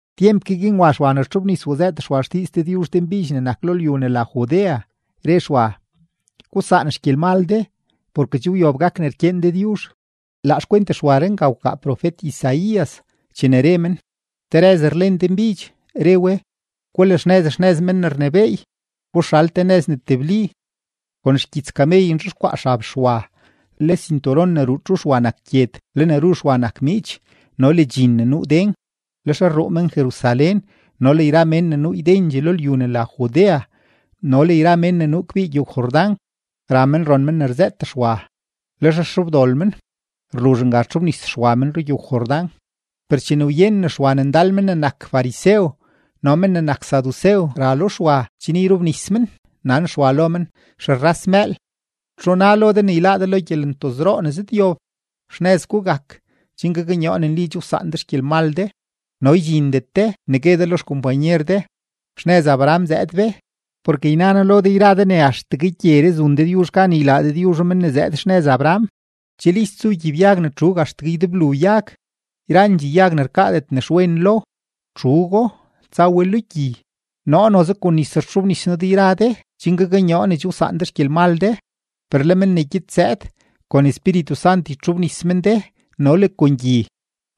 Tyemp ke guin wa Xwa ne rtxobnis wzëët Xwa xdiiz Dëdyuzh denbidx ne nak lo lyu ne la Judea, re Xwa: ―Gusaan xgyelmal de, porke che wyob gak ne rkyeen Dëdyuzh. Laa xkwent Xwaree nga wkaa profet-Isaías chene re men: Te rëz rlen denbidx, re we: “Gulaxnëz xnëz Men ne rnebééy, guxal te nëz ne tebli.” Kon xgyits kamey nzhexkwaa xab Xwa, le sinturon ne ruu txu Xwa nak gyed, le ne ru Xwa nak miich no le dxin ne nuu den. Lex rruu men-Jerusalén no le yra mén ne nuu ydendxee lo lyu ne la Judea no le yra men nuu kbii rugyow-Jordán, ra men ron men ne rzëët Xwa. Lex rxobdol men, rluzh nga rtxobnis Xwa men rugyow-Jordán. Per chene wyenen Xwa ne ndal men ne nak farisew no le men ne nak sadusew ra lo Xwa chen yrobnis men, nan Xwa lo men: ―¡Xerras mëël! ¿Txu na lo de ne yláá de lo gyelentozroo ne zëdyob? Xnëz gugak chen gaknyoo ne nli che wsaan de xgyelmal de, no ydxindet de ne gue de lo xkompanyer de: “Xnëz Abraham zëëd be”; porke yna noo lo de yra de ne axtegue gyeree zun Dëdyuzh gan ylaa Dëdyuzho men ne zëëd xnëz Abraham. Che list zu gyibyag ne txuug axtegue ydeblu yag; yrandxee yag ne rkaadet nexwen lo, txuugo, tsa we lo gyi. Noo noze kon nis rtxobnis noo de yra de chen gaknyoo ne che wsaan de xgyelmal de; per le men ne gyed zëëd, kon Espíritu Sant ytxobnis men de no le kon gyi.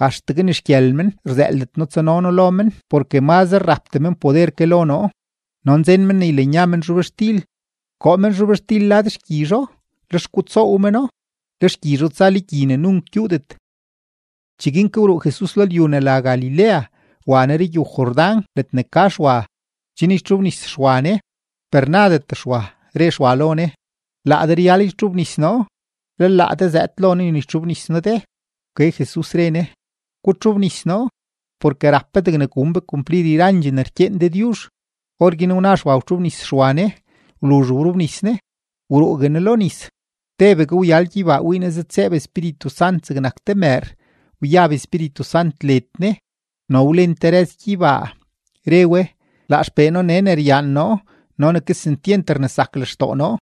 Axtegue ni xgyël men rzëëldet noo tsano noo lo men porke mazre rapdee men poder ke lo noo. No nzen men ne ylanya men zhobxtil, koo men zhobxtil lad xgyizho, lex gutsoow meno; le xgyizho tsa lo gyi ne nunk gyuudet. Cheguin ke wruu Jesus lo lyu ne la Galilea wa Ne rugyow-Jordán ledne ka Xwa, chen ytxobnis Xwa Ne, per nadet Xwa, re Xwa lo Ne: ―Laa de ryal ytxobnis noo, lel laa de zëëd lo noo ne ytxobnis noo de. Wke Jesus, re Ne: ―Gutxobnis noo, porke rap be degne gun be kumplir yrandxee ne rkyeen Dëdyuzh. Orguin wna Xwa wtxobnis Xwa Ne. Wluzh wrobnis Ne, wruugue Ne lo nis, tebegue wyal gyeybaa, wii Ne zëdtseeb Espíritu Sant zegnak te mëër, wyab Espíritu Sant led Ne, no wlen te rëz gyeybaa, re we: ―Laa XPee noo nee ne ryaan noo no ne kesentyent rnesak lextoo noo.